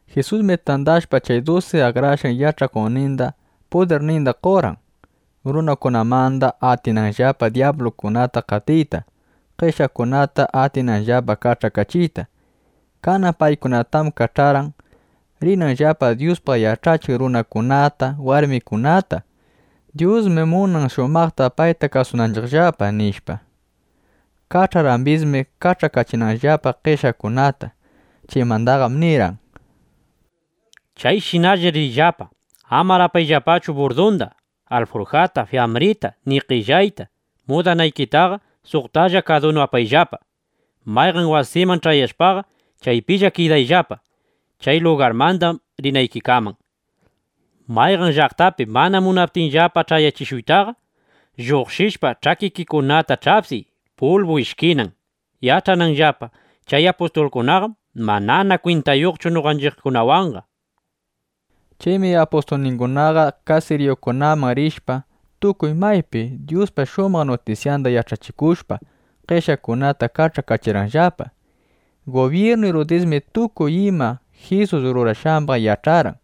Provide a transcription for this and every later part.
Jisusmi tandashpa chay dusi akrashqan yach'akuqninda, pudirninda qorqan, runakunamanda atinanllapa dyablukunata qatiyta, qeshyaqkunata atinanllapa kach'akachiyta. Kanan paykunatam kach'arqan, rinanllapa Dyuspaq yach'achiq runakunata, warmikunata: “Dyusmi munan shumaqta payta kasunanchiqllapa”, nishpa. Kach'arqambismi, kach'akachinanllapa qeshyaqkunata. Chaymandaqam nirqan: —Chayshinallar riyllapa. Amar apayllapachu burdunda, alfurjata, fiyambrita, ni qellayta. Mudanaykitaqa suqtalla kadunu apayllapa. Mayqan wasiman ch'ayashpaqa, chaypilla kidayllapa, chay lugarmanda rinaykikaman. Mayqan llaqtapi mana munaptinllapa ch'ayachishuytaqa, lluqshishpa, ch'akikikunata ch'apsiy pulbu ishkinan, yach'ananllapa: Chay apustulkunaqam manana kwintayuqchu noqanchiqkunawanqa, nishpa. Chaymi apustulningunaqa kasiriyukunaman rishpa, tukuy maypi Dyuspa shumaq nutisyanda yach'achikushpa, qeshyaqkunata kach'akachirqanllapa. Gubyirnu Irudismi tukuy ima Jisus rurashqambaq yach'arqan.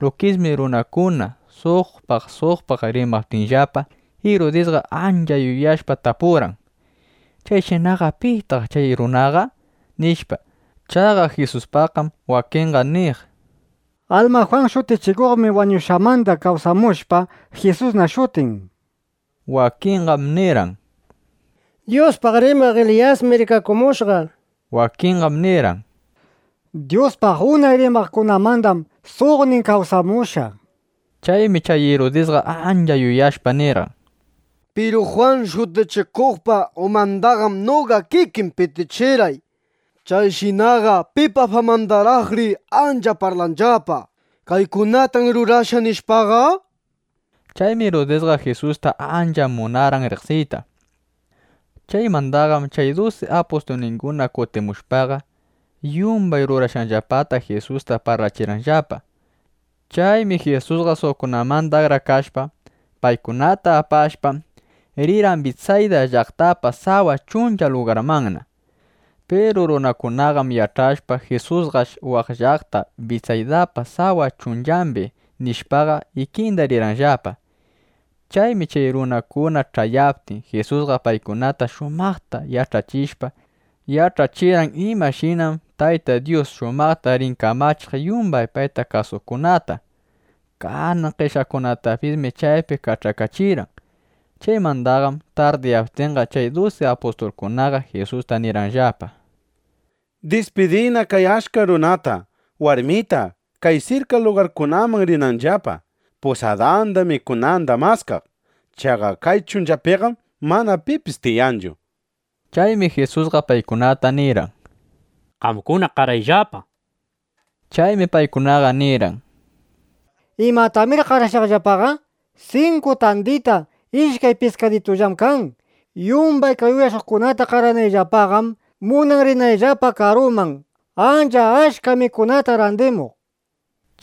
Lukismi runakuna suqpaq suqpaq rimaptinllapa, Irudisqa ancha yuyashpa tapurqan: “¿Chayshinaqa pitaq chay runaqa?” nishpa. Chaqa Jisuspaqqam wakinqa niq: “Alma Jwan Shutichikuqmi wañushqanmanda kawsamushpa, Jisusna shutin”, nishpa. Wakinqam nirqan: “Dyuspaq rimaq Eliyasmi rikakumushqa”, nishpa. Wakinqam nirqan: “Dyuspaq unay rimaqkunamandam suqnin kawsamushqa”, nishpa. Chaymi chay Irudisqa ancha yuyashpa nirqan: —Piru Jwan Shutichikuqpa umandaqam noqa kikiy pitichirqay. ¿Chayshinaqa pipa famandaraqri ancha parlanllapa: “Kaykunatam rurashqa”, nishpaqa? Chaymi Irudisqa Jisusta ancha munarqan riqsiyta. Chaymandaqam chay dusi apustulninguna kutimushpaqa, yumbay rurashqanllapata Jisusta parlachirqanllapa. Chaymi Jisusqa suqkunamanda akrakashpa, paykunata apashpa, rirqan Bitsayda llaqtapa sawa chuncha lugarmanna. Piru runakunaqam yach'ashpa: Jisusqash waq llaqta Bitsaydapa sawa chunchambi, nishpaqa, ikinda rirqanllapa. Chaymi chay runakuna ch'ayaptin, Jisusqa paykunata shumaqta ch'ayachishpa, yach'achirqan imashinam Tayta Dyus shumaqta rin kamachiq yumbay payta kasuqkunata. Kanan qeshyaqkunatapismi chaypiqa kach'akachirqan. Chaymandaqam tardiyaptinqa, chay dusi apustulkunaqa Jisusta nirqanllapa: —Dispidiyna kay achka runata, warmita, kay sirka lugarkunaman rinanllapa, pusadanda, mikunanda maskaq. Chaqa kay chunchapiqam mana pipis tiyanchu, nishpa. Chaymi Jisusqa paykunata nirqan: —Qamkuna qarayllapa, nishpa. Chaymi paykunaqa nirqan: —¿Imatanamir qarashaqllapaqa? Sinku tandita, ishkay piskaditullam kan. Yumbay kay uyashuqkunata qaranayllapaqam munan rinayllapa karuman, ancha achka mikunata randimuq, nishpa.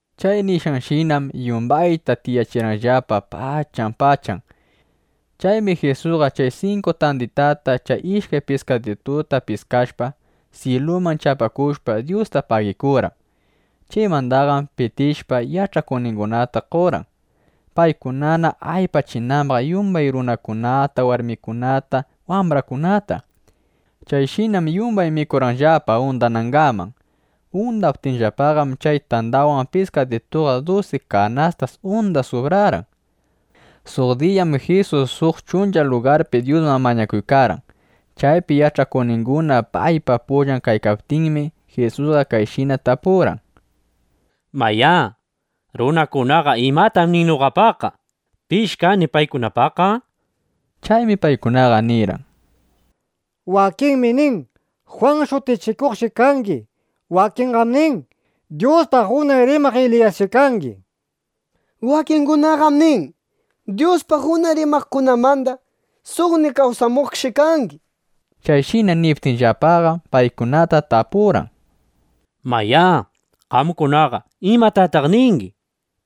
Chay nishqanshinam yumbayta tiyachirqanllapa pachan pachan. Chaymi Jisusqa chay sinku tanditata chay ishkay piskadituta piskashpa, syiluman chapakushpa, Dyusta pagikurqan. Chaymandaqam pitishpa, yach'akuqningunata qorqan, paykunana aypachinambaq yumbay runakunata, warmikunata, wambrakunata. Chayshinam yumbay mikurqanllapa undanangaman. Undaptinllapaqam chay tandawan pijisituqa dusi kanastas unda subrarqan. Suq diyam Jisus suq chuncha lugarpi Dyusman mañakuykarqan. Chaypi yach'akuqninguna paypa pullan kaykaptinmi, Jisusqa kayshina tapurqan: —Mayá, runakunaqa ¿imatam nin noqapaqqa? ¿Pish kani paykunapaqqa? nishpa. Chaymi paykunaqa nirqan: —Wakinmi nin, Jwan Shutichikuqshi kangi. Wakinqam nin, Dyuspaq unay rimaq Eliyasshi kangi. Wakingunaqam nin, Dyuspaq unay rimaqkunamanda suqnin kawsamuqshi kangi, nishpa. Chayshina niptinllapaqam, paykunata tapurqan: —Mayá, qamkunaqa ¿imatataq ningi?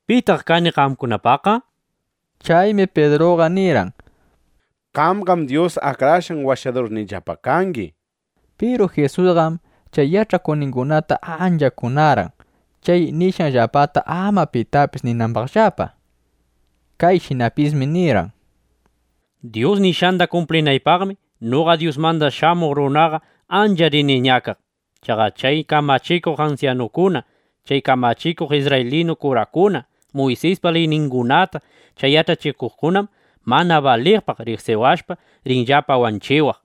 ¿Pitaq kani qamkunapaqqa? nishpa. Chaymi Pidruqa nirqan: —¡Qamqam Dyus Akrashqan Washadurniyllapa kangi! nishpa. Piru Jisusqam chay yach'akuqningunata ancha kunarqan, chay nishqanllapata ama pitapis ninambaqllapa. Kayshinapismi nirqan: —Dyus nishqanda kumplinaypaqmi noqa Dyusmanda Shamuq Runaqa ancha rini ñakaq. Chaqa chay kamachikuq ansyanukuna, chay kamachikuq isrraylinu kurakuna, Muysispa liyningunata chay yach'achikuqkunam mana baliqpaq riqsiwashpa, rinllapa wanchiwaq.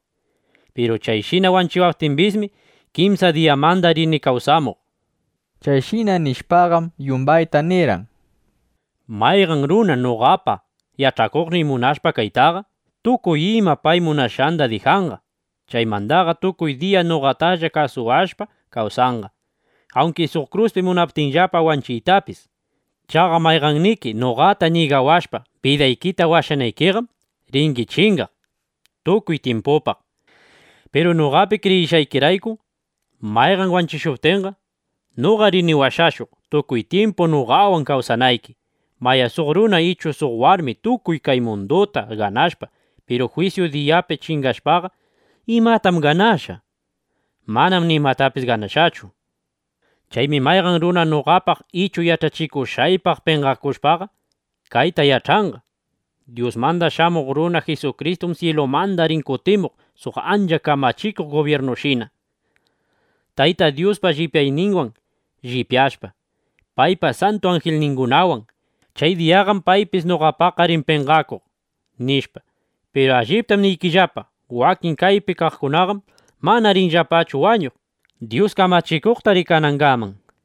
Piru chayshina wanchiwaptimbismi, kimsa diyamanda rini kawsamuq, nishpa. Chayshina nishpaqam, yumbayta nirqan: —Mayqan runa noqapa yach'akuqniy munashpa kaytaqa, tukuy ima pay munashqanda dijanqa. Chaymandaqa tukuy diya noqatalla kasuwashpa kawsanqa, awnki suq kruspi munaptinllapa wanchiytapis. Chaqa mayqanniki noqata ñigawashpa, bidaykita washanaykiqam, ringi chingaq tukuy tyimpupaq. Piru noqapi kriyishqaykirayku mayqan wanchishuptinqam, noqa rini washashuq, tukuy tyimpu noqawan kawsanayki. Mayá, suq runa ichu suq warmi tukuy kay munduta ganashpa, piru jwisyu diyapi chingashpaqa, ¿imatam ganashqa? Manam nimatapis ganashqachu. Chaymi mayqan runa noqapaq ichu yach'achikushqaypaq penqakushpaqa, kayta yach'anqa: Dyusmanda Shamuq Runa Jisukristum syilumanda rin kutimuq suq ancha kamachikuq gubyirnushina, Tayta Dyuspa llipyayninwan llipyashpa, paypa santu anjilningunawan. Chay diyaqam paypis noqapaqqa rin penqakuq, nishpa. Piru alliptam niykillapa, wakin kaypi kaqkunaqam mana rinllapachu wañuq, Dyus kamachikuqta rikanangaman, nishpa.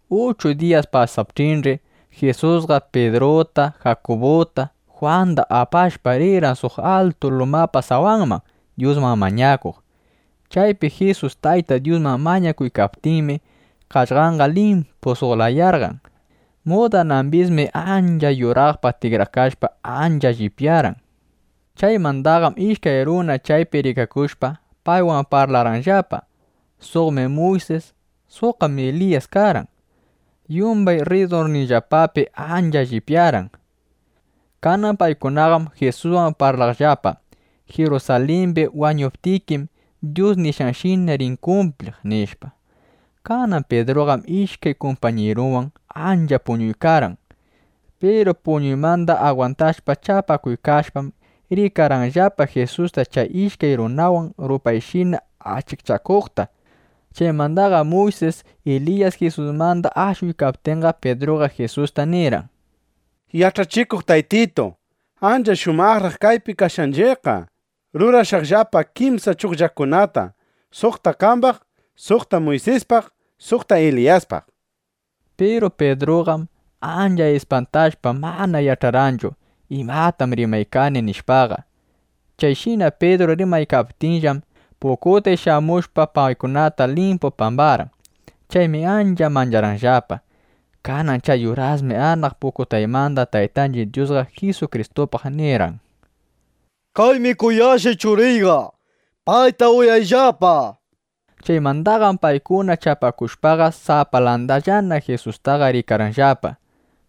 Uchu diyas pasaptinch'i, Jisusqa Pidruta, Jakubuta, Jwanda apashpa, rirqan suq atun lumapa sawanman, Dyusman mañakuq. Chaypi Jisus Tayta Dyusman mañakuykaptinmi, qaqllanqa limpu suq layayarqan. Mudanambismi ancha yuraqpaq tikrakashpa, ancha llipyarqan. Chaymandaqam ishkay runa chaypi rikakushpa, paywan parlarqanllapa. Suqmi Muysis, suqqam Eliyas karqan. Yumbay rridurninllapapi ancha llipyarqan. Kanan paykunaqam Jisuswan parlaqllapa: —Jirusalimbi wañuptikim, Dyus nishqanshina rin kumpliq, nishpa. Kanan Pidruqam ishkay kumpañirunwan ancha puñunaykarqan. Piru puñuymanda agwantashpa, chapakuykashpam, rikarqanllapa Jisusta chay ishkay runawan rupayshina achikchakuqta. Chaymanda Muysis, Eliyas Jisusmanda ashuykaptinqam, Pidruqa Jisusta nirqan: —¡Yach'achikuq Taytitu, ancha shumaqraq kaypi kashqanchiqqa! Rurashaqllapa kimsa chugllakunata, suqta qambaq, suqta Muysispaq, suqta Eliyaspaq, nishpa. Piru Pidruqam ancha ispantashpa, mana yach'arqanchu: Imatam rimaykani, nishpaqa. Chayshina Pidru rimaykaptinllam, pukutay shamushpa, paykunataqa limpu pambarqan. Chaymi ancha mancharqanllapa. Kanan chay urasmi anaq pukutaymanda Taytanchiq Dyusqa Jisukristupaq nirqan: —Kaymi kuyashqay Churiyqa. Payta uyayllapa, nishpa. Chaymandaqam paykuna chapakushpaqa, sapalandallana Jisustaqa rikarqanllapa.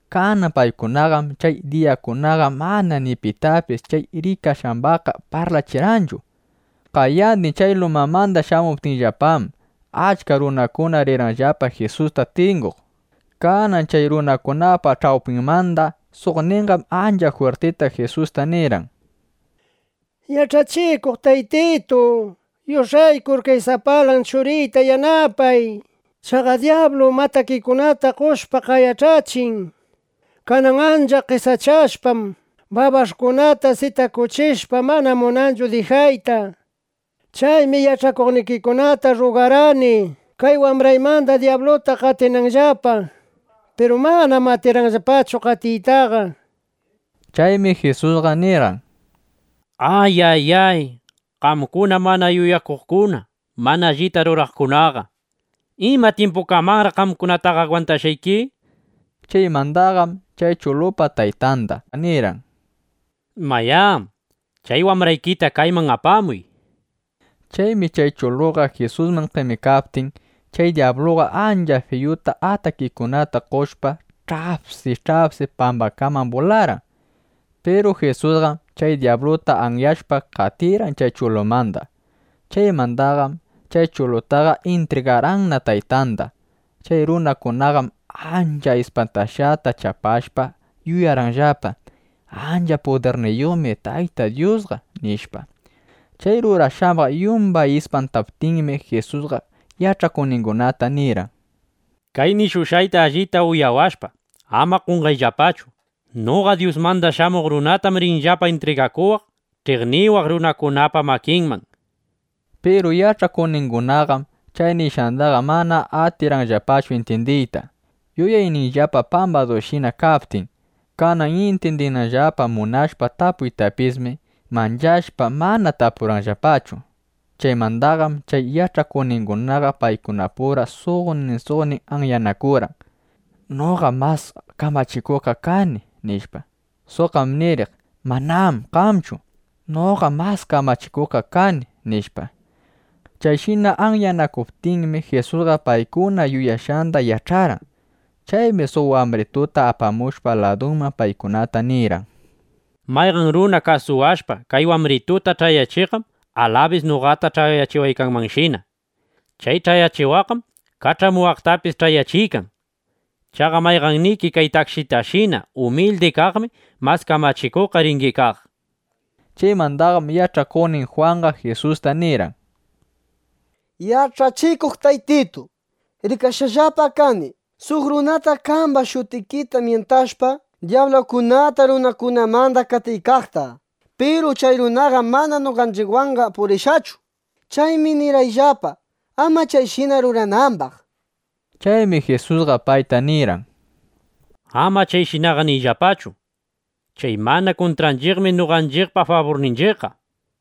Kanan paykunaqam chay diyakunaqa mana ni pitapis chay rikashqambaqqa parlachirqanchu. Qayandin chay lumamanda shamuptinllapam, achka runakuna rirqanllapa Jisusta tinguq. Kanan chay runakunapa ch'awpinmanda suqninqam ancha jwirtita Jisusta nirqan: —¡Yach'achikuq Taytitu, yush'aykur kay sapalan churiyta yanapay! Chaqa dyablum atakikunata qoshpa, qayach'achin. Kanan ancha qesachashpam, babash'kunata sitakuchishpa, mana munanchu dijayta. Chaymi yach'akuqnikikunata rrugarqani, kay wambraymanda dyabluta qatinanllapa. Piru manam atirqanllapachu qatiytaqa, nishpa. Chaymi Jisusqa nirqan: —¡Ayayay, qamkuna mana yuyakuqkuna, mana allita ruraqkunaqa! ¿Ima tyimpukamanraq qamkunataqa agwantashqayki? Chaymandaqam chay chulupa taytanda nirqan: —Mayá, chay wambraykita kayman apamuy, nishpa. Chaymi chay chuluqa Jisusman qemikaptin, chay dyabluqa ancha fiyu atakikunata qoshpa, ch'apsi ch'apsi pambaman bularqan. Piru Jisusqam chay dyabluta anyashpa, qatirqan chay chulumanda. Chaymandaqam chay chulutaqa intrigarqanna taytanda. Chay runakunaqam ancha ispantashqata chapashpa, yuyarqanllapa: Ancha pudirniyuqmi Tayta Dyusqa, nishpa. Chay rurashqambaq yumbay ispantaptinmi, Jisusqa yach'akuqningunata nirqan: —Kay nishushqayta allita uyawashpa, ama qonqayllapachu. Noqa Dyusmanda Shamuq Runatam rinllapa intrigakuwaq ch'iqniwaq runakunapa makinman, nishpa. Piru yach'akuqningunaqam chay nishqandaqa mana atirqanllapachu intyindiyta, yuyayninllapa pambadushina kaptin. Kanan intyindinanllapa munashpa tapuytapismi, manchashpa, mana tapurqanllapachu. Chaymandaqam chay yach'akuqningunaqa paykunapura suqnin suqnin anyanakurqan: —Noqam mas kamachikuqqa kani, nishpa. Suqqam niriq: —Manam qamchu; noqam mas kamachikuqqa kani, nishpa. Chayshina anyanakuptinmi, Jisusqa paykuna yuyashqanda yach'arqan. Chaymi suq wambrituta apamushpa ladunman, paykunata nirqan: —Mayqan runa kasuwashpa, kay wambrituta ch'ayachiqqam alabis noqata ch'ayachiwaykanmanshina. Chay ch'ayachiwaqqam kach'amuwaqtapis ch'ayachiykan. Chaqa mayqanniki kay takshitashina umildi kaqmi mas kamachikuqqa ringi kaq, nishpa. Chaymandaqam yach'akuqnin Jwanqa Jisusta nirqan: —Yach'achikuq Taytitu, rikashqallapam kani suq runata qamba shutikita myintashpa, dyablukunata runakunamanda qatiykaqta. Piru chay runaqam mana noqanchiqwanqa purishqachu. Chaymi nirqayllapa, ama chayshina ruranambaq, nishpa. Chaymi Jisusqa payta nirqan: —Ama chayshinaqa niyllapachu. Chay mana kuntranchiqmi noqanchiqpa faburninchiqqa, nishpa.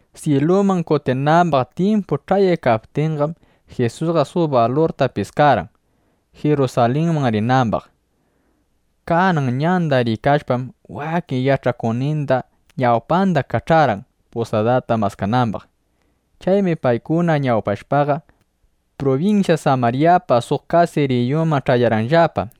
Syiluman kutinambaq tyimpu ch'ayaykaptinqam, Jisusqa suq balurta piskarqan, Jirusalinman rinambaq. Kanan ñanda riykashpam, wakin yach'akuqninda ñawpanda kach'arqan, pusadata maskanambaq. Chaymi paykuna ñawpashpaqa, prubinsya Samaryapa suq kasiriyunman ch'ayarqanllapa.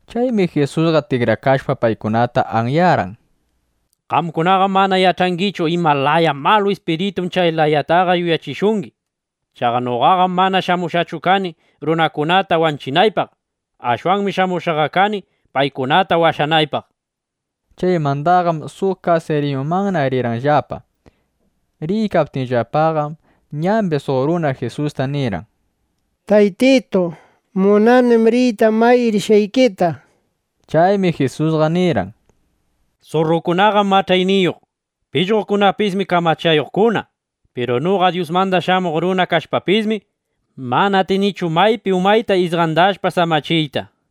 Chaymi Jisusqa tikrakashpa, paykunata anyarqan: ˻—Qamkunaqam mana yach'angichu ima laya malu ispiritum chay layataqa yuyachishungi, nishpa. Chaqa noqaqam mana shamushqachu kani, runakunata wanchinaypaq. Ashwanmi shamushqaqa kani, paykunata washanaypaq, nishpa.˼ Chaymandaqam suq kasiriyumanna rirqanllapa. Riykaptinllapaqam ñambi suq runa Jisusta nirqan: —Taytitu, munanim riyta may rishqaykita, nishpa. Chaymi Jisusqa nirqan: —Surrukunaqam mach'ayniyuq. Pishqokunapismi kamachayuqkuna. Piru noqa Dyusmanda Shamuq Runa kashpapismi, mana atinichu maypi umayta isqandashpa samachiyta, nishpa.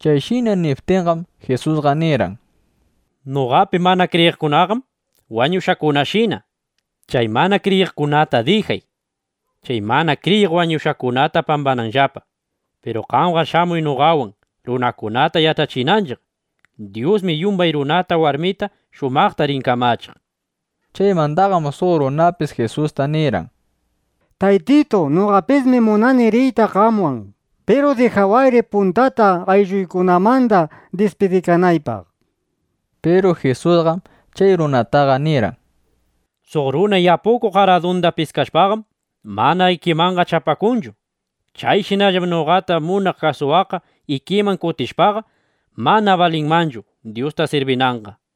Chayshina niptinqam, Jisusqa nirqan: —(Noqapi mana kriyiqkunaqam wañushqakunashina.) Chay mana kriyiqkunata dijay, chay mana kriyiq wañushqakunata pambananllapa. Piru qamqa shamuy noqawan, runakunata yach'achinanchiq: Dyusmi yumbay runata, warmita shumaqta rin kamachiq, nishpa. Chaymandaqam suq runapis Jisusta nirqan: —Taytitu, noqapismi munani riyta qamwan. Piru dijawayri puntata aylluykunamanda dispidikanaypaq, nishpa. Piru Jisusqam chay runataqa nirqan: —Suq runa yapukuq aradunda piskashpaqam, mana ikimanqa chapakunchu. Chayshinallam noqata munaq kasuwaqqa ikiman kutishpaqa, mana balinmanchu, Dyusta sirbinanqa, nishpa.